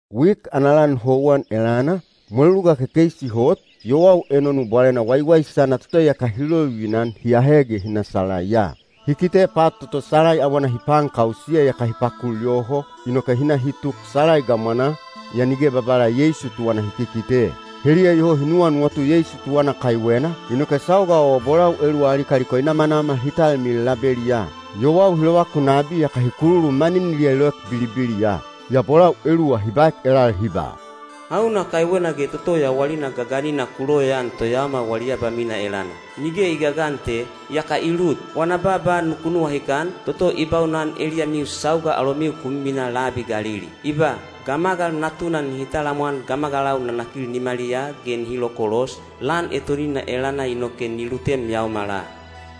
Wik ana lan houwan elana, mweluluga kekeisi hot, yowau enonu bwalena waiwaisana toto iyaka hi lovivina-an hi ahe ge hi na salaiya. Hi kite pat toto salai awana hi paankausiya iyaka hi pakul yoho, inoke hi na hi tuk salai gamwanaa, yaa nige Babala Yeisu tuwana hi kikite. Heliya iyoho hi nuwanuwatu Yeisu tuwana kaiwena, inoke sauga o bolau eluwa ali kaliko i namanamal hi talmilil labeliyaa. Yowau hi lovakun nabi yaka hi kululu maniniliya i loek bilibiliya. Yaa bolau eluwa hi baek elal hi ba, “Hauna kaiwena ge toto yawalina gaganina ku loyaan toyaomal wali abamina elana? Nige i gagan te, iyaka i lut! Wana baaba nuku nuwahikan, toto i baunan eliyamiu sauga alomiu ku miminaa labi Galili. I ba, ‘Gamagal Natuna nihi talamwan gamagalau nanakil nimaliyaa ge nihi lokolos, lan etonina elana inoke ni lutem yaomala.’”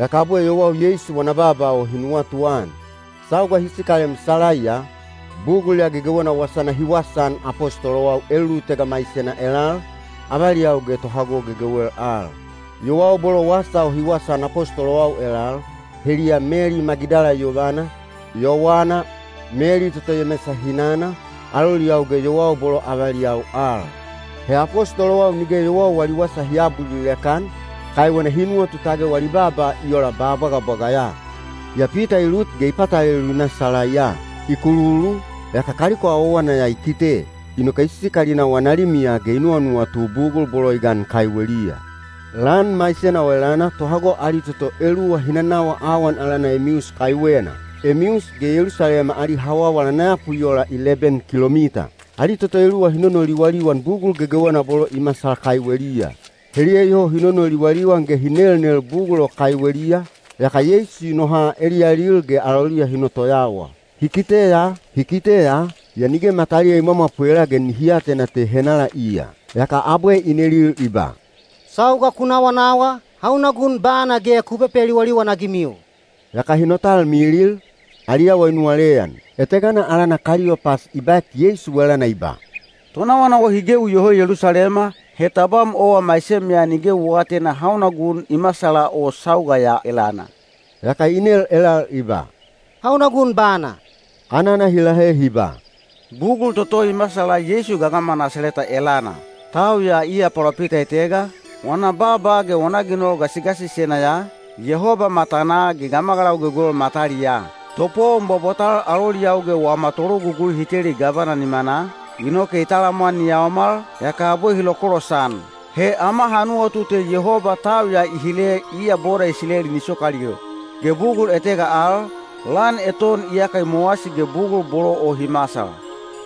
Yaka abwe yowau Yeisu wana baaba o hi nuwatuan. Sauga hi sikalem salaiya, bugul ya gegewena wasana hi wasaan apostolowau elulutega maisena elal, avaliyau ge tohago gegewel al. Yowau bolo wasa o hi wasaan apostolowau elal, heliya Meli Magidala yovana, Yowana, Meli toto Yemesa hinana, aloliyau ge yowau bolo avaliyau al. He apostolowau nige yowau wali wasa hi aabulilek-an, kaiwena hi nuwatu tage wali baaba i ola ba bwagabwaga ya. Yaa Pita i lut ge i patalelu i na salaiya. I kululu, yaka kaliko awawana ya i kite. Inoke i sikal i na wana limiya ge i nuwanuwatu bugul bolo i gan kaiweliya. Lan maisena o elana tohago ali toto eluwa hi nanawa awan alana Emius kaiwena. Emius ge Yelusalema ali hawawal ana yapu i ola leben kilomita. Ali toto eluwa hi nonoliwaliwan bugul gegewena bolo i masal kaiweliya. Heliya iyoho hi nonoliwaliwan ge hi nelnel bugul o kaiweliya, yaka Yeisu i noha eliyalil ge aloliya hi notoyawa. Hi kite ya, yaa nige mataliya i mwamwapwela ge nihi atena te henala iya. Yaka abwe i nelil i ba, “Sauga ku nawanawa, hauna gun bana ge ku pepeliwaliwan-agimiu?” Yaka hi notalmilil, ali awa i nuwaleyan. Etegana alana Kaliyopas i baek Yeisu elana i ba, “Tonawanawa hi gewi iyoho Yelusalema, he tabam owa maisem ya nige u aatena hauna gun i masala o sauga ya elana.” Yaka i nel elal i ba, “Hauna gun bana?” Anana hi lahe hi ba, “Bugul toto i masal Yeisu gagama Nasaleta elana. Tau ya iya palopita etega, wana baaba ge wana ginol gasigasisena ya, Yehoba matanaa ge gamagalau gegewel mataliyaa. Topowon bwabwatal aloliyau ge wama tologugui hi teli gavana nimanaa, inoke i talamwan ni yaomal, yaka abwe hi lokolosan. He ama ha nuwatu te Yehoba tau ya i hile iya boda Isileli ni sokalil. Ge bugul etega al, lan eton iyaka i mowasi ge bugul bolo o hi masal.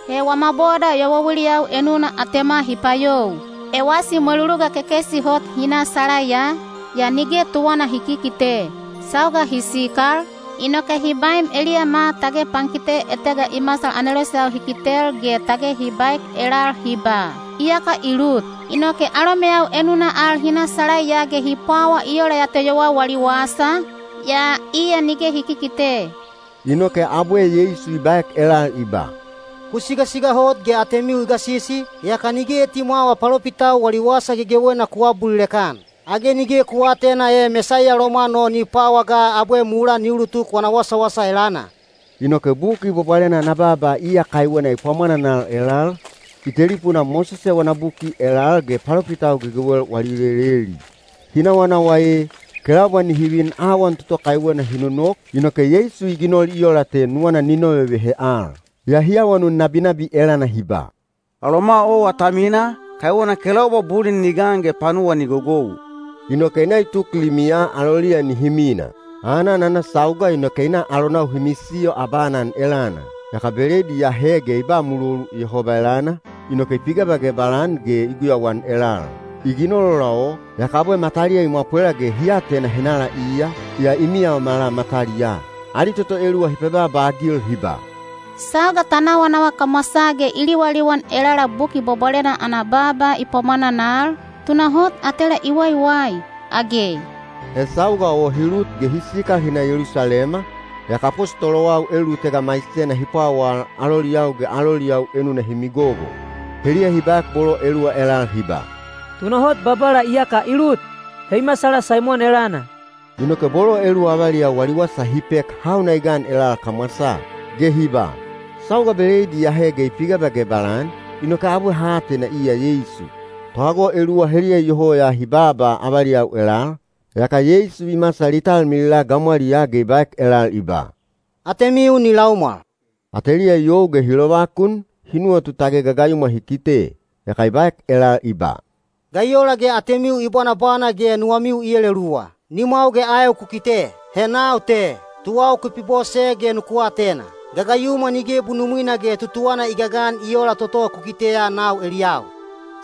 He wama boda yowauiliyau enuna atema hi payou. Ewasi mweluluga kekeisi hot hi na salaiya, yaa nige tuwana hi kikite. Sauga hi sikal, inoke hi baem eliyama tage pankite etega i masal aneloseyau hi kitel ge tage hi baek elal hi ba, ‘Iyaka i lut.’ Inoke alomeyau enuna al hi na salaiya ge hi pwawa i ola ya te yowau wali wasa, yaa iya nige hi kikite.” Inoke abwe Yeisu i baek elal i ba, “Ku sigasiga hot ge atemiu i gasisi, yaka nige etimwawa palopitau wali wasa gegewena ku aabulilek-an. Age nige ku aatena e Mesaiya lomwan o ni pwawa ga abwe mulaa ni ulutuk wana wasawasa elana?” Inoke Buki Bwabwalena ana baaba iya kaiwena i pwamwananal elal, i telipunaa Mosese wana buki elal ge palopitau gegewel wali leleli. Hi nawanawa ee, kelaubwa nihi vin awan toto kaiwena hi nonok, inoke Yeisu i ginol i ola te nuwana ni novevehe al. Yaa hi awanun nabinabi elana hi ba, “Aloma owa ta mina, kaiwena kelaubwa bulin ni gan ge panuwa ni gogou.” Inoke i na i tuk limiya aloliya nihi mina. Aanan ana sauga inoke i na alonau hi misiyo abaanan elana. Yaka beleid i ahe ge i ba mulolu Yehoba elana, inoke i pigebagebal-an ge i guyauan elal. I ginol ola o, yaka abwe mataliya i mwapwela ge hi atena henala iya, yaa i miyaomala mataliyaa. Ali toto eluwa hi pebaaba-agil hi ba, “Sauga ta nawanawa kamwasaa ge i liwaliwan elala Buki Bwabwalena ana baaba i pwamwananal, tunahot atela i waiwai, age?” He sauga o hi lut ge hi sikal hi na Yelusalema, yaka apostolowau elulutega maisena hi pwawal aloliyau ge aloliyau enuna hi migogo. Heliya hi baek bolo eluwa elal hi ba, “Tunahot Babala iyaka i lut. He i masala Saimon elana.” Inoke bolo eluwa avaliyau wali wasa hi pek hauna i gan elal kamwasaa. Ge hi ba, “Sauga beleid i ahe ge i pigebagebal-an, inoke abwe ha atena iya Yeisu.” Tohago eluwa heliya iyoho ya hi baaba avaliyau elal, yaka Yeisu i masal i talmilila gamwaliyaa ge i baek elal i ba, “Atemiu ni laumwal!” Ateliya i you ge hi lovakun, hi nuwatu tage gagayumwa hi kite. Yaka i baek elal i ba, “Ga i ola ge atemiu i bwanabwana ge nuwamiu i eleluwa? Nimwau ge aeu ku kite. He nau te! Tuwau ku pibose ge nuku atena. Gagayumwa nige bunumwina ge tutuwana i gagan i oola toto ku kiteya nau eliyau.”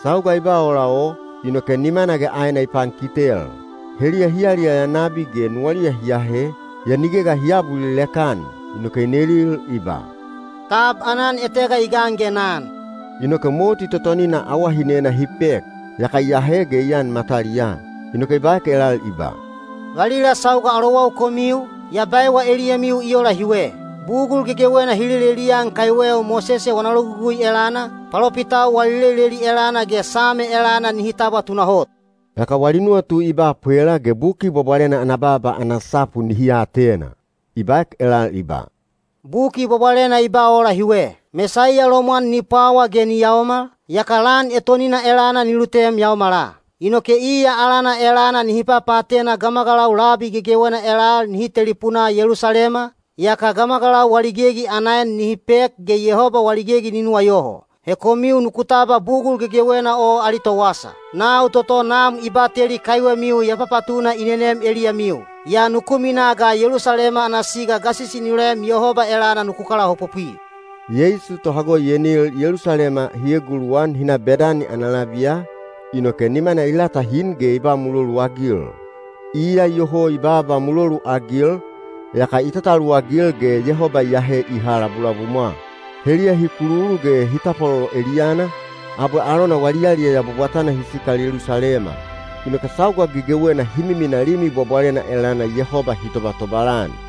Sauga i ba ola o, inoke nimana ge aena i pankitel. Heliya hi yaliyaya nabi ge nuwaliya hi ahe, yaa nige ga hi aabulilek-an. Inoke i nelil i ba, “Tab aanan etega i gan ge na an?” Inoke moti totonina awahinena hi pek, yaka i ahe ge i an mataliyaa. Inoke i baek elal i ba, “Valila sauga alowau komiu, ya baewa eliyamiu i ola hiwe: bugul gegewena hi lelelian kaiweu Mosese wana logugui elana, palopitau wali leleli elana ge Same elana nihi tabwa tunahot.” Yaka wali nuwatu i ba pwela ge Buki Bwabwalena ana baaba ana sapu nihi atena. I baek elal i ba, “Buki Bwabwalena i ba ola hiwe. Mesaiya lomwan ni pwawa ge ni yaomal, yaka lan etonina elana ni lutem yaomala. Inoke iya alana elana nihi papaatena gamagalau labi gegewena elal nihi telipunaa Yelusalema, yaka gamagalau wali gegi ana en nihi pek ge Yehoba wali gegi ni nuwayoho. He komiu nuku tabwa bugul gegewena o ali towasa. Nau toto Nam i bateli kaiwemiu ya papatuna i nenem eliyamiu. Yaa nuku minaa ga Yelusalema ana siga gasisi ni loem Yehoba elana nuku kalaopopwi.” Yeisu tohago i enil Yelusalema hi eguluwan hi na Bedani ana labiya, inoke nimana i latahin ge i ba muloluagil. Iya iyoho i baaba muloluagil, yaka i tataluwagil ge Yehoba i ahe i ha labulabumwa. Heliya hi kululu ge hi tapwalolo eliyana, abwe alona wali yaliyaya bwabwatana hi sikal Yelusalema. Inoke sauga gegewena hi miminaa Limi Bwabwalena elana Yehoba hi tobatobal-an.